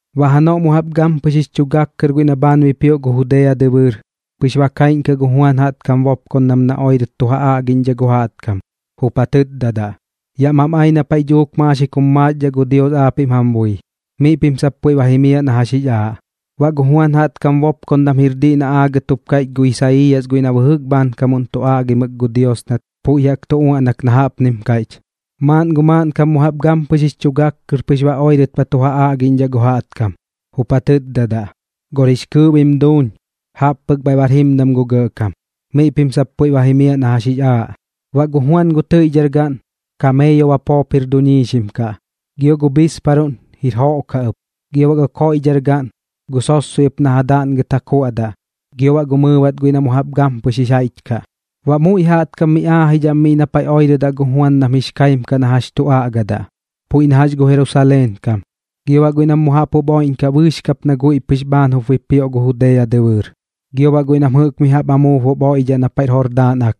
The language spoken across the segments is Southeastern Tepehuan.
Baꞌ janoꞌ mu jaꞌp gampɨx jix chu gak kɨr guiꞌ na bhaan bipioꞌ gu Judea dɨbɨɨr, pɨx ba kaiꞌñkaꞌ gu Juan jaꞌtkam bopkondam na oirɨt tu ja aꞌgiꞌñdhaꞌ gu jaꞌtkam, jup ja tɨtdadaꞌ: ―Yaꞌ mam ai na paiꞌ dhuuk maaxik jum maaxdhaꞌ gu Dios aapiꞌm jam bui. Miꞌ pim sap puiꞌ ba jimiaꞌ na jax jix aaꞌ. Baꞌ gu Juan jaꞌtkam bopkondam jir diꞌ na aagɨt jup kaiꞌch gu Isaiiyas guiꞌ na bɨjɨk bhaankamuꞌn tu aꞌgimɨk gu Dios nat puiꞌ jaꞌk tu uaꞌnak na jaꞌpnim kaiꞌch: Maaꞌn gu maaꞌnkam mu jaꞌp gampɨx jix chu gak kɨr pɨx oirɨt ba tu ja aꞌgiꞌñdhaꞌ gu jaꞌtkam, jup ja tɨtdadaꞌ: “Gor jix kɨɨꞌ bim duuñ, jaꞌp pɨk bhaiꞌ bar jimdam gu Gɇꞌkam. Miꞌ pim sap puiꞌ ba jimiaꞌ na jax jix aaꞌ.” Baꞌ gu Juan gu tɨiꞌdhar gaꞌn, kameeyo bapoo jir jup duiñxim kaꞌ, gio gu bhiisparuꞌn jir joꞌ kaꞌ ɨp. Gio baꞌ gu koiꞌdhar gaꞌn, gu sossoi ɨp na ja daꞌngɨt ja kuaꞌdaꞌ gio baꞌ gu mɨɨbat guiꞌ na mu jaꞌp gampɨx jix jaiꞌch kaꞌ. Baꞌ muiꞌ jaꞌtkam miꞌ aajidhaꞌ am miꞌ na paiꞌ oirɨdaꞌ gu Juan nam jix kaim kaꞌ na jax tu aꞌgadaꞌ, puiꞌ na jax gu Jerusaleen kam, gio baꞌ guiꞌ nam mu jaꞌp jup oiꞌñkaꞌ bɨɨx kap guiꞌ na dhiꞌ pɨx bhaan jup bipioꞌ gu Judea dɨbɨɨr, gio baꞌ guiꞌ nam jɨꞌk mi jaꞌp amuub jup oiꞌdhaꞌ na paiꞌr Jordaan Ak.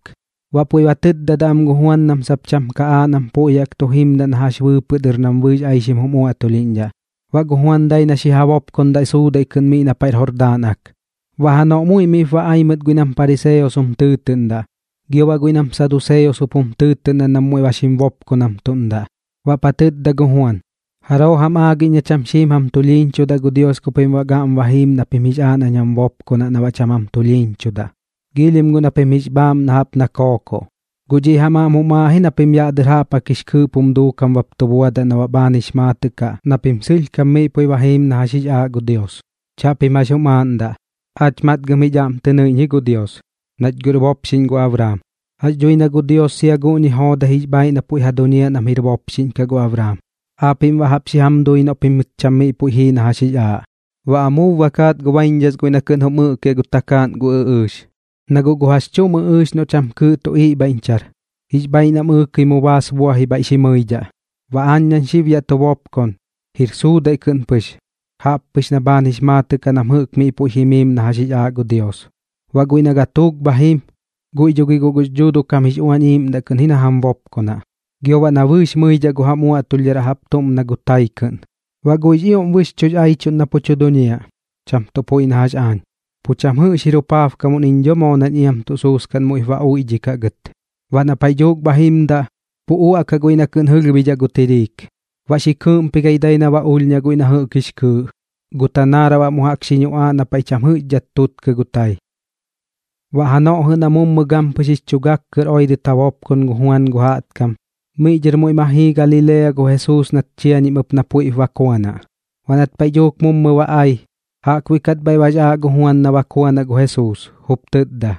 Baꞌ puiꞌ ba tɨtdadaꞌ am gu Juan nam sap cham ka aaꞌ nam puiꞌ jaꞌk tu jimdaꞌ na jax bɨɨpɨꞌ dɨr nam bɨɨx aixim jum uaꞌtulhiꞌñdhaꞌ, baꞌ gu Juan dai na xi ja bopkondaꞌ suudaiꞌ kɨꞌn miꞌ na paiꞌr Jordaan Ak. Baꞌ janoꞌ muiꞌ miꞌp ba ai mɨt guiꞌ nam pariseos jum tɨɨtɨꞌndaꞌ gio baꞌ guiꞌ nam saduseos jup jum tɨɨtɨꞌndaꞌ nam puiꞌp xim bopkonamtuꞌ. Baꞌp ja tɨtda gu Juan: ―¿Jaroo jam aagiꞌñ na cham xiim jam tulhiiñchudaꞌ gu Dios ku pim baꞌ gaꞌm ba jiim na pim jix aaꞌ nañ jam bopkonaꞌ na baꞌ cham jam tulhiiñchudaꞌ? Giilhim guꞌ na pim jix bhaaꞌmnaꞌ jaꞌp na gu kookoꞌ. Guꞌ dhiꞌ jam aꞌm jum aaꞌ ji na pim yaꞌ dɨr jaꞌp jaꞌk jix kɨɨꞌp jum duukam bap tu buadaꞌ na baꞌ bhaan jix maatɨꞌ kaꞌ na pim sɨlhkam miꞌ puiꞌ ba jiim na jax jix aaꞌ gu Dios. Chaꞌpim jax jum aaꞌndaꞌ: “Aach matgɨm jich aꞌm tɨ nɨiꞌñ ji gu Dios, nach guꞌr bopxiꞌñ gu Abraam.” Jax dhui na guꞌ gu Dios sia guꞌñi joodai jix bhaaiꞌ na puiꞌ ja duñiaꞌ nam jir bopxiꞌñ kaꞌ gu Abraam, aapiꞌm baꞌ jaꞌp xi jam dui noꞌ pimɨt cham miꞌ puiꞌ jii na jax jix aaꞌ. Baꞌ amuub ba kaat gu baiñdhas guiꞌ na kɨꞌn jum ɨꞌkiaꞌ gu takaaꞌn gu ɨꞌɨɨx, na guꞌ gu jax chuꞌm ɨꞌɨɨx noꞌ cham kɨɨꞌ tu iꞌbhaiꞌñchar, jix bhaaiꞌ nam ɨɨkɨi mu baas buaji bhaiꞌ xi mɨidhaꞌ. Baꞌ aañ nañ xib yaꞌ tu bopkon, jir suudaiꞌ kɨꞌn pɨx, jaꞌppɨx na bhaan jix maatɨꞌ kaꞌ nam jɨꞌk miꞌ puiꞌ jimiim na jax jix aaꞌ gu Dios. Baꞌ guiꞌ na gatuuk bha jim, guiꞌ dho gi guꞌ gux Dhuuduꞌ kam jix Uañ Iiꞌmdaꞌ ji na kɨꞌn jam bopkonaꞌ, gio baꞌ na bɨɨx mɨidhaꞌ gu jam uaꞌtulhdharaꞌ jaꞌp tuꞌm na gu tai kɨꞌn. Baꞌ guiꞌx ioꞌm bɨxchuꞌx aichuꞌn na pu tu duñiaꞌ, cham tuꞌ puiꞌ na jax aañ. Pu cham jɨꞌx jir jupaabkamuꞌn iñ dho moo nam iam tuꞌ suuskaꞌn muiꞌ ba uiꞌdhikaꞌ gɨt. Baꞌ na paiꞌ dhuuk bha jimdaꞌ, pu uaꞌkaꞌ guiꞌ na kɨꞌn jɨlhbidhaꞌ gu tiriik, baꞌ xi kɨɨꞌmpigai dai ba ulhñaꞌ guiꞌ na jɨꞌk jix kɨɨꞌ, gu tanaaraꞌ baꞌ mu jaꞌk xi ñuꞌaaꞌ na paiꞌ cham jɨꞌxkat tuutkɨ gu tai. Baꞌ janoꞌ jɨꞌ na mummɨ gampɨx jix chu gak kɨr oirɨt ja bopkon gu Juan gu jaꞌtkam, miꞌ dhɨr muiꞌ ma jii Galilea gu Jesuus nat ba chiañim ɨp na puiꞌp bakuanaꞌ. Baꞌ nat paiꞌ dhuuk mummɨ ba ai, jaꞌkbuiꞌ kat bhaiꞌ bax aaꞌ gu Juan na bakuanaꞌ gu Jesuus, jup tɨtda: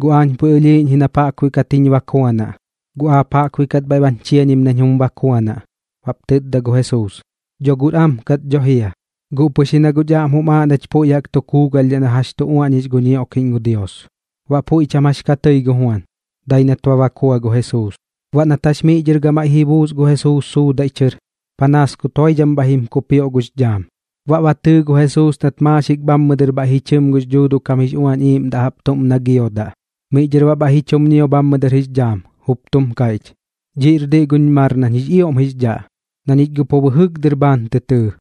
―Guꞌ aañ puiꞌ ɨlhiiꞌñ ji nap aap jaꞌkbuiꞌ kat jiñ bakuanaꞌ, guꞌ aap jaꞌkbuiꞌ kat bhaiꞌ bañ chiañim nañ jum bakuanaꞌ. Baꞌp tɨtda gu Jesuus: ―Dho guꞌr am kat dho jia, guꞌ pɨx ji na guꞌch aꞌm jum aaꞌ nach puiꞌ jaꞌk tu kuugalhdhaꞌ na jax tu uaꞌñix gu ñioꞌkiꞌñ gu Dios. Baꞌ puiꞌ cham jax ka tɨi gu Juan, dai nat ba bakua gu Jesuus. Baꞌ nat jax miꞌ dhɨr gamaiꞌ ji buus gu Jesuus suudaiꞌ chɨr, panaas kut joidham bhaiꞌ jim kukpioꞌ gux dhaam, baꞌ ba tɨɨ gu Jesuus nat maaxik bhammɨ dɨr bhaiꞌ ji chɨm gux Dhuuduꞌ kam jix Uañ Iiꞌmdaꞌ jaꞌp tuꞌm na gu giodaꞌ. Miꞌ dhɨr baꞌ bhaiꞌ ji chum ñio bhammɨ dɨr jix dhaam, jup tum kaiꞌch: ―Dhiꞌñir diꞌ guñ mar nañ jix ioꞌm jix dhaꞌ, na ñich guꞌ pu bɨjɨk dɨr bhaan tɨ tɨɨ.